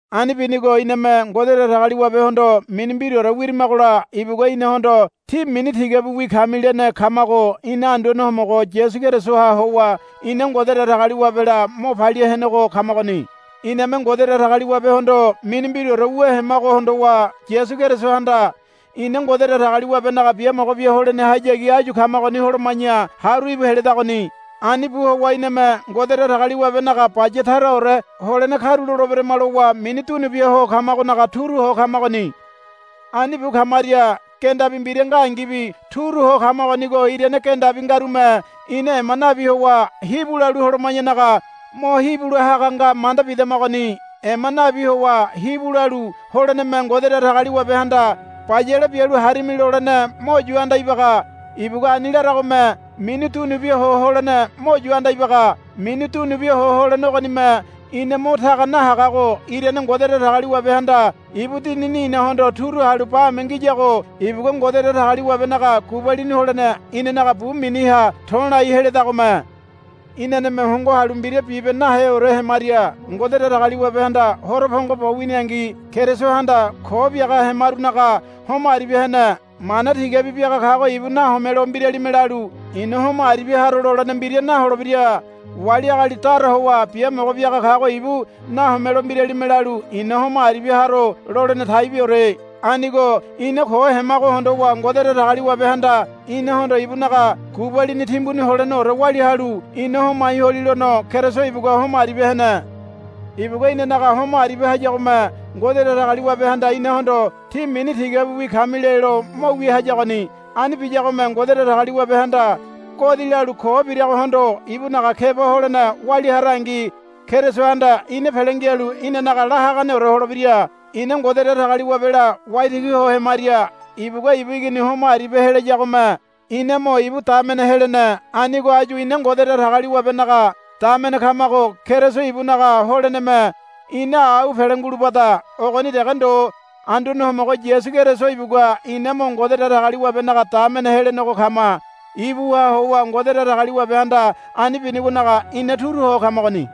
Ani binigo iname Ngode Datagaliwabehondo mini mbiraore wirimagola ibugua inahondo, Tí mini tigabiwi kami, lene kamago ina Anduane Homogo Yasu Kerisoha howa ina Ngode Datagaliwabela mo palia henego kamagoni. Iname Ngode Datagaliwabehondo mini mbiraore wu hemago hondowa Yasu Kerisohanda ina Ngode Datagaliwabenaga biamogo bia holenehayagi áyu kamagoni holoma̱ya haru íbu heledagoni. Ani bu howa iname Ngode Datagaliwabenaga baya taraore holene karuloleberama lowa mini dunubiaho kamagonaga turu ho kamagoni. Ani bu kamaria gendabi mbira ngangibi turu ho kamagonigo irane gendabi ngarume ina ema nabi howa hibu lalu holoma̱yanaga mo hibu lahaga nga manda bidamagoni. Ema nabi howa hibu lalu holeneme Ngode Datagaliwabehanda, Bayale bialu harimi, lolene mo yu anda ibaga. Ibugua ani laragome mini dunubia ho holene mo yu anda ibaga. Mini dunubia ho holene ogonime ina mo taga nahagago irane Ngode Datagaliwabehanda ibu Dinini inahondo turu halu bame ngiyago ibugua Ngode Datagaliwabenaga gubalini holene inanaga bu miniha to̱lai heledagome. Inaneme hongo halu mbira bibe naheore hemaria Ngode Datagaliwabehanda horo pongo bo winiangi Kerisohanda ko biaga hemarunaga homo aribia hene. Mana tigabi biaga kago ibu nahomelo mbiralime lalu, I̱na homo aribia haro, lolene mbira naholebira. Wali agali dara howa biamogo biaga kago ibu nahomelo mbiralime lalu, I̱na homo aribia haro, lolene taibiore. Anigo ina ko hemago hondowa Ngode Datagaliwabehanda inahondo ibunaga gubalini timbuni holeneore walia halu ina homai holilono Keriso ibugua homo aribia hene. Ibugua inanaga homo aribia hayagome Ngode Datagaliwabehanda inahondo, Tí mini tigabiwi kami, lelo mo wia hayagoni. Ani biyagome Ngode Datagaliwabehanda godi lalu ko biragohondo ibunaga keba holene walia harangi Kerisohanda ina pele ngialu inanaga la haganeore holebira. Ina Ngode Datagaliwabela waitigi ho hemaria ibugua ibu Igini homo aribia helayagome ina mo ibu damene helene. Anigo áyu ina Ngode Datagaliwabenaga damene kamago Keriso ibunaga holeneme ina au pele ngulubada. Ogoni dege ndo Anduane Homogo Yasu Keriso ibugua ina mo Ngode Datagaliwabenaga damene helenego kama. Ibuha howa Ngode Datagaliwabehanda ani binigonaga ina turu ho kamagoni.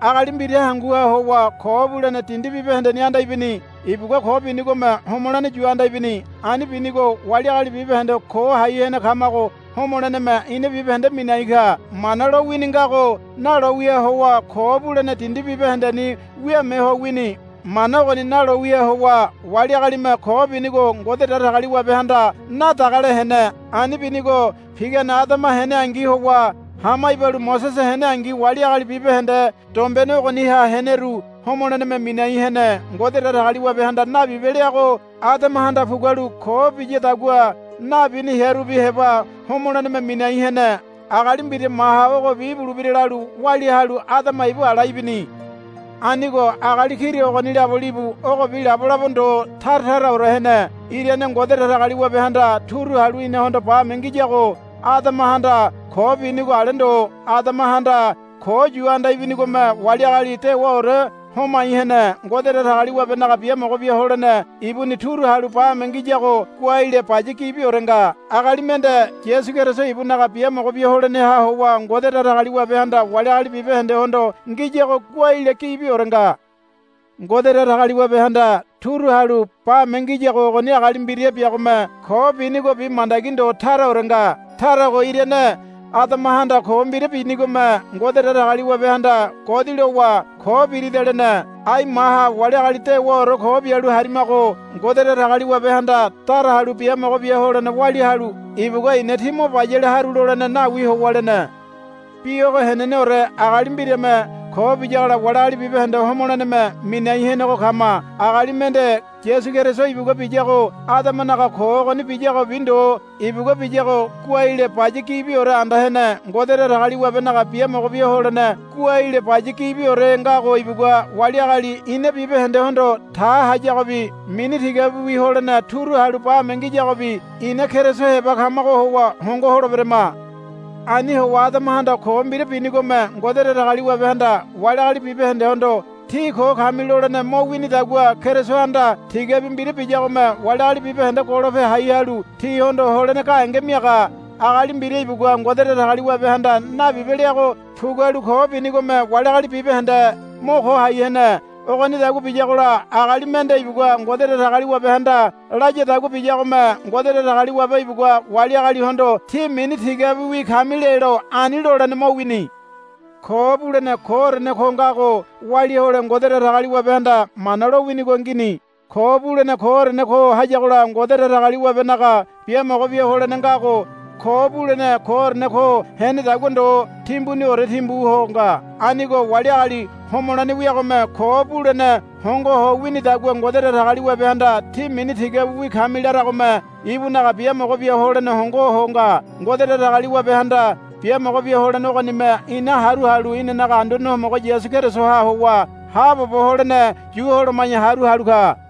Agali mbira hanguha howa ko bulene dindi bibahendeni anda ibini. Ibugua ko binigome homolene yu anda ibini. Ani binigo wali agali bibahende ko hai hene kamago homoleneme ina bibahende minai ka. Mana lowini ngago nalowiha howa ko bulene dindi bibahendeni wiame ho wini. Mana ogoni nalowiha howa wali agalime ko binigo Ngode Datagaliwabehanda nadagale hene. Ani binigo pigane Adama heneangi howa hama ibalu Mosese heneangi wali agali bibahende dombene ogoniha heneru homoleneme minai hene. Ngode Datagaliwabehanda, Nabibe, leago Adamahanda pugualu ko biyadagua nabini hearubi heba homoleneme minai hene. Agali mbira maha ogobi ibulebira lalu walia halu Adama ibu ala ibini. Anigo agali kira ogoni labo libu ogobi labo labo ndo tara taraore hene. Irane Ngode Datagaliwabehanda turu halu inahondo bame ngiyago Adamahanda ko binigo ale ndo. Adamahanda ko yu anda ibinigome wali agali dewaore homai hene. Ngode Datagaliwabenaga biamogo bia holene ibuni turu halu bame ngiyago goaile baya gibiore nga. Agali mende Yasu Keriso ibunaga biamogo bia holeneha howa Ngode Datagaliwabehanda wali agali bibahendehondo ngiyago goaile gibiore nga. Ngode Datagaliwabehanda turu halu bame ngiyago ogoni agali mbira biagome ko binigobi mandagi ndo taraore nga. Tarago irane Adamahanda ko mbira binigome Ngode Datagaliwabehanda godi lowa, Ko birida, lene. Ai maha wali agali dewaore ko bialu harimago Ngode Datagaliwabehanda dara halu biamogo bia holene walia halu ibugua, I̱na tí mo bayale haru, lolene nawi howa lene. Bi ogo heneneore agali mbirame ko biyagola wali agali bibahende homoleneme minai henego kama. Agali mende Yasu Keriso ibugua biyago Adamanaga ko ogoni biyagobi ndo ibugua biyago goaile baya gibiore anda hene. Ngode Datagaliwabenaga biamogo bia holene goaile baya gibiore ngago ibugua wali agali ina bibahendehondo ta hayagobi mini tigabiwi holene turu halu bame ngiyagobi ina Keriso heba kamago howa hongo holeberama. Ani howa Adamahanda ko mbira binigome Ngode Datagaliwabehanda wali agali bibahendehondo, Tí ko kami, lolene mo winidagua Kerisohanda tigabi mbira biyagome wali agali bibahende golope hai halu tihondo holene gahenge miaga. Agali mbira ibugua Ngode Datagaliwabehanda, Nabibe, leago pugualu ko binigome wali agali bibahende mo ko hai hene. Ogonidagua biyagola agali mende ibugua Ngode Datagaliwabehanda layadagua biyagome Ngode Datagaliwabe ibugua wali agalihondo, Tí mini tigabiwi kami, lelo ani lolene mo wini. Ko bulene koorene ko ngago walia hole Ngode Datagaliwabehanda Mana lo winigo ngini. Ko bulene koorene ko hayagola Ngode Datagaliwabenaga biamogo bia holene ngago ko bulene koorene ko henedagua ndo timbuniorene timbu ho nga. Anigo wali agali homolene wiagome ko bulene hongo ho winidagua Ngode Datagaliwabehanda, Tí mini tigabiwi kami, laragome ibunaga biamogo bia holene hongo ho nga. Ngode Datagaliwabehanda biamogo bia holene ogonime ina haru halu inanaga Anduane Homogo Yasu Kerisoha howa haabobo holene yu holoma̱ya haru halu ka.